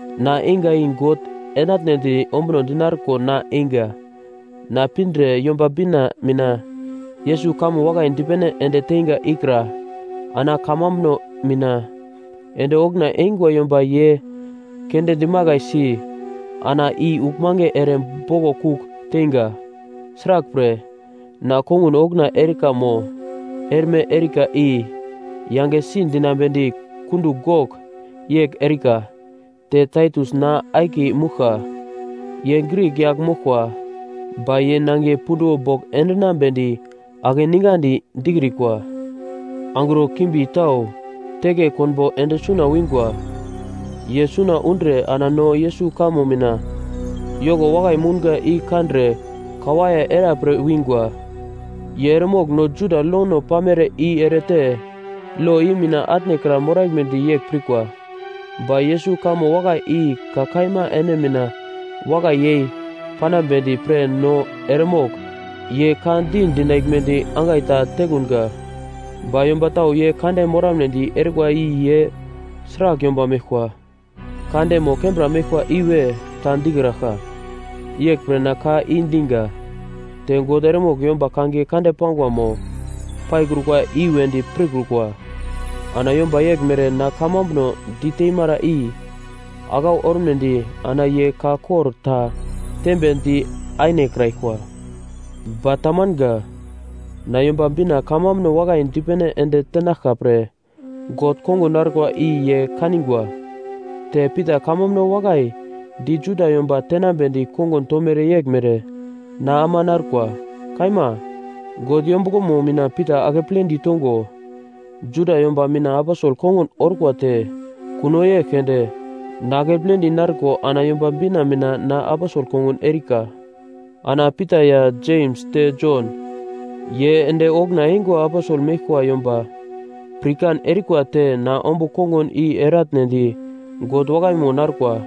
Na einga, i God enatnedi ombuno dinarko na einga. Na pindre Yomba Bina mina Yesus kamo wakai dipene ende teiga ikra ana kamambuno mina ende okuna eingwa yomba ye keunde dimakaisi ana i uglmange ere boglo kugl teinga. Sraglpre, na kongun okuna erika mo erme erika i yangesi dinambedi kundugl gogl yegl erika. Te Taitus na akiye mouglka, ye Grik yagl moglkwa, ba ye nangiye punduwo bogl endinambedi akeningandi dikrikwa. Angro kimbi tau teke konbo ende suna wingwa. Ye suna undre ana no Yesus kamo mina yoko wakai mounga i kandre kawaiye era pre wingwa. Ye eremogl no Juda lono pamere i erete lo i mina atnekra moraglmedi yegl pirkwa. Ba Yesus kamo wakai i ka kaima ene mina wakai yei panambedi pre no eremogl ye ka di dinaglmedi angai ta tekunga. Ba yomba tau ye kande moramnedi erikwa i ye sragl yomba meglkwa, kande mo kembra meglkwa iwe ta dikraglka, yeglpre na ka i diga. Te God eremogl yomba kangiye kande pangwa mo paikrukwa i-wedi pirkrukwa. Ana yomba yeglmere na kamambuno diteimara i aglau ormedi ana ye ka kor ta tembe di ainekraglkwa. Ba tamanga, na Yomba Bina kamambuno wakai dipene ende tenaglka pre God kongun narkwa i ye kanigwa, te Pita kamambuno wakai di Juda yomba tenambedi kongun tomere yeglmere na ama narkwa. Kaima, God yombuglomo mina Pita akepledi tongo, Juda yomba mina aposel kongun orkwa te kuno yegl keunde na akepledi narko ana Yomba Bina mina na aposel kongun erika. Ana Pita ya Jems te Jon, ye ende okuna eingwa aposel meglkwa yomba pirkan erikwa te na ombugl kongun i eratnedi God wakaimo narkwa,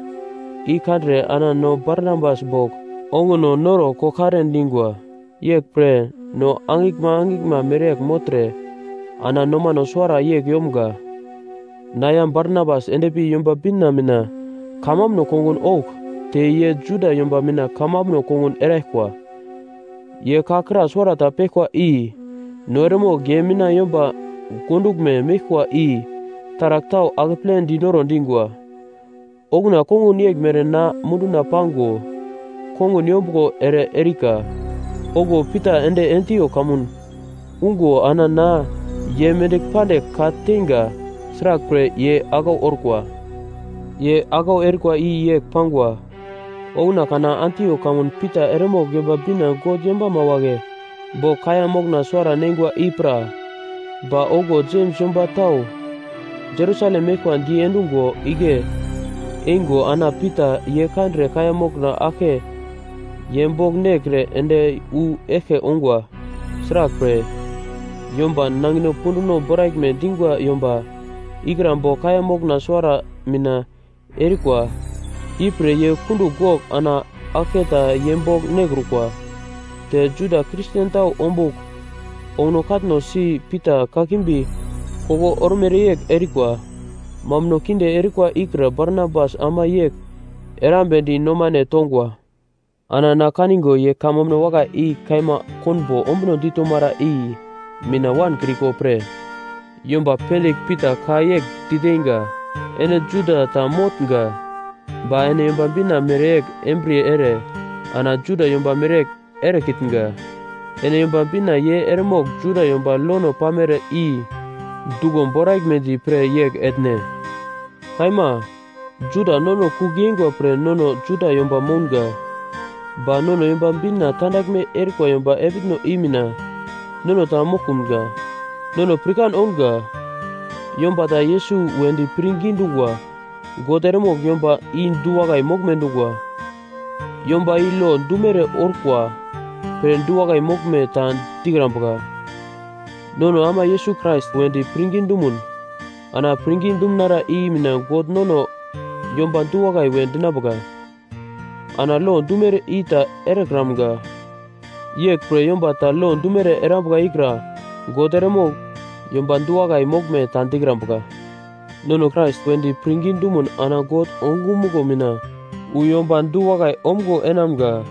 i kandre ana no Barnabas bogl onguno noro koglkare dingwa, yeglpre no angiglma angiglma mereyegl mogltre ana nomano suwara yegl yomga: Na ya Barnabas ende pi Yomba Bina mina kamambuno kongun ougl te ye Juda yomba mina kamambuno kongun eraglkwa. Ye ka kra suwarata peglkwa i no eremogl ye mina yomba gonduglme meglkwa i taragl tau akeple diro dingwa, okuna kongun yeglmere na munduna pago kongun yombuglo ere erika. Okuwo Pita ende Antiok kamun ungo ana na ye mendigl pandigl ka-teinga; sraglpre, ye aglau orkwa. Ye aglau erikwa i yegl pangwa: Okuna kana Antiok kamun Pita eremogl Yomba Bina God yombama wagle bogl kaiya mokna suwara neingwa i pra. Ba okuwo Jems yomba tau Jerusalem meglkwa diendungo igle eingo ana Pita ye kandre kaiya mokna aglke ye bogl nekre ende wu eglke ongwa. Sraglpre, yomba nangino punduno boraglme dingwa yomba ikra bogl kaiya mokna suwara nina erikwa ipre ye kundugl gogl ana aglketa ye bogl nekrukwa. Te Juda Kristen tau ombugl onguno katno si Pita kakimbi koglo ormere yegl erikwa. Mambuno kinde erikwa ikra Barnabas ama yegl erambedi nomane tongwa. Ana na kanigo ye kamambuno wakai i kaima konbo ombuno ditomara i mina wankriko pre, yomba pendigl Pita ka yegl diteinga, “Ene Juda ta motnga, ba ene Yomba Bina mereyegl embriye ere ana Juda yomba mereyegl erekitnga. Ene Yomba Bina ye eremogl Juda yomba lono pamere i duglo boraglmedi pre yegl etne?” Kaima, Juda nono kugl yeingwa pre nono Juda yomba mounga, ba nono Yomba Bina tandaglme erikwa yomba epitno i mina nono ta moglkunga. Nono pirkan ounga, yomba ta Yesus wedi pirngi dungwa, God eremogl yomba i du-wakai moglme dungwa. Yomba i lo dumere orkwa pre du-wakai moglme ta dikrambuka. Nono ama Yesus Krais wedi pirngi dumun ana pirngi dumunara i mina God nono yomba du-wakai we dinambuka. Ana lo dumere i ta erekramga. Yeglpre yomba ta lo dumere erambuka ikra God eremogl yomba du-wakai moglme ta dikrambuka. Nono Krais wedi pirngi dumun ana God ongumuglo mina wu yomba du-wakai omgo enamga,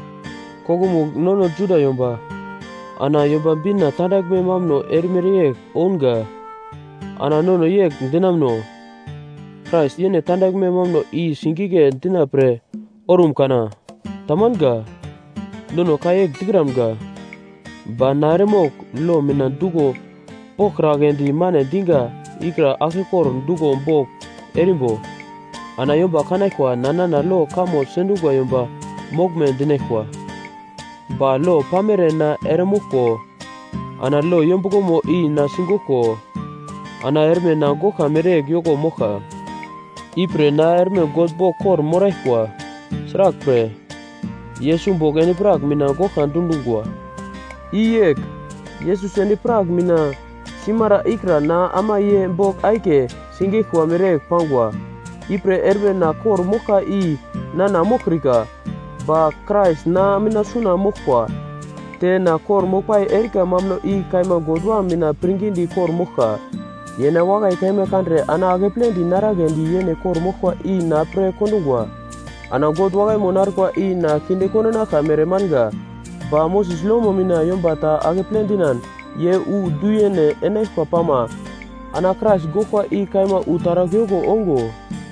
koglomugl nono Juda yomba ana Yomba Bina tandaglme mambuno erimere yegl ounga. Ana nono yegl dinamuno, Krais yene tandaglme mambuno i singigle dina pre orum kana? Tamanga. Nono ka yegl dikramga. Ba na eremogl lo mina duglo boglkragledi mane diga ikra aglkekor duglo bogl erimbo, ana yomba kanaglkwa nana lo kamo sendungwa yomba moglme dinaglkwa. Ba lo pamere na eremoglko ana lo yombuglomo i na sigoglko ana erme na goglka mereyegl yoko moglka. Ipre na erme God bogl kor-moraglkwa. Sraglpre, Yesus bogl endi-prak mina goglka dundungwa. I yegl, Yesus endi-prak mina simara ikra na ama ye bogl akiye sigeglkwa mereyegl pangwa. Ipre erme na kor-moglka i nana moglkrika, ba Krais na mina suna moglkwa, te na kor-moglpai erika mambuno i kaima God Wam mina pirngidi kor-moglka. Ye na wakai kaima kandre ana akepledi naraglendi yene kor-moglkwa i na pre kondungwa. Ana God wakaimo narkwa i na kinde kondinaglka mere manga. Ba Moses lomo mina yomba ta akeple dinan ye wu du-yene enaglkwa pama ana Krais goglkwa i kaima wu taragl yoko ongo.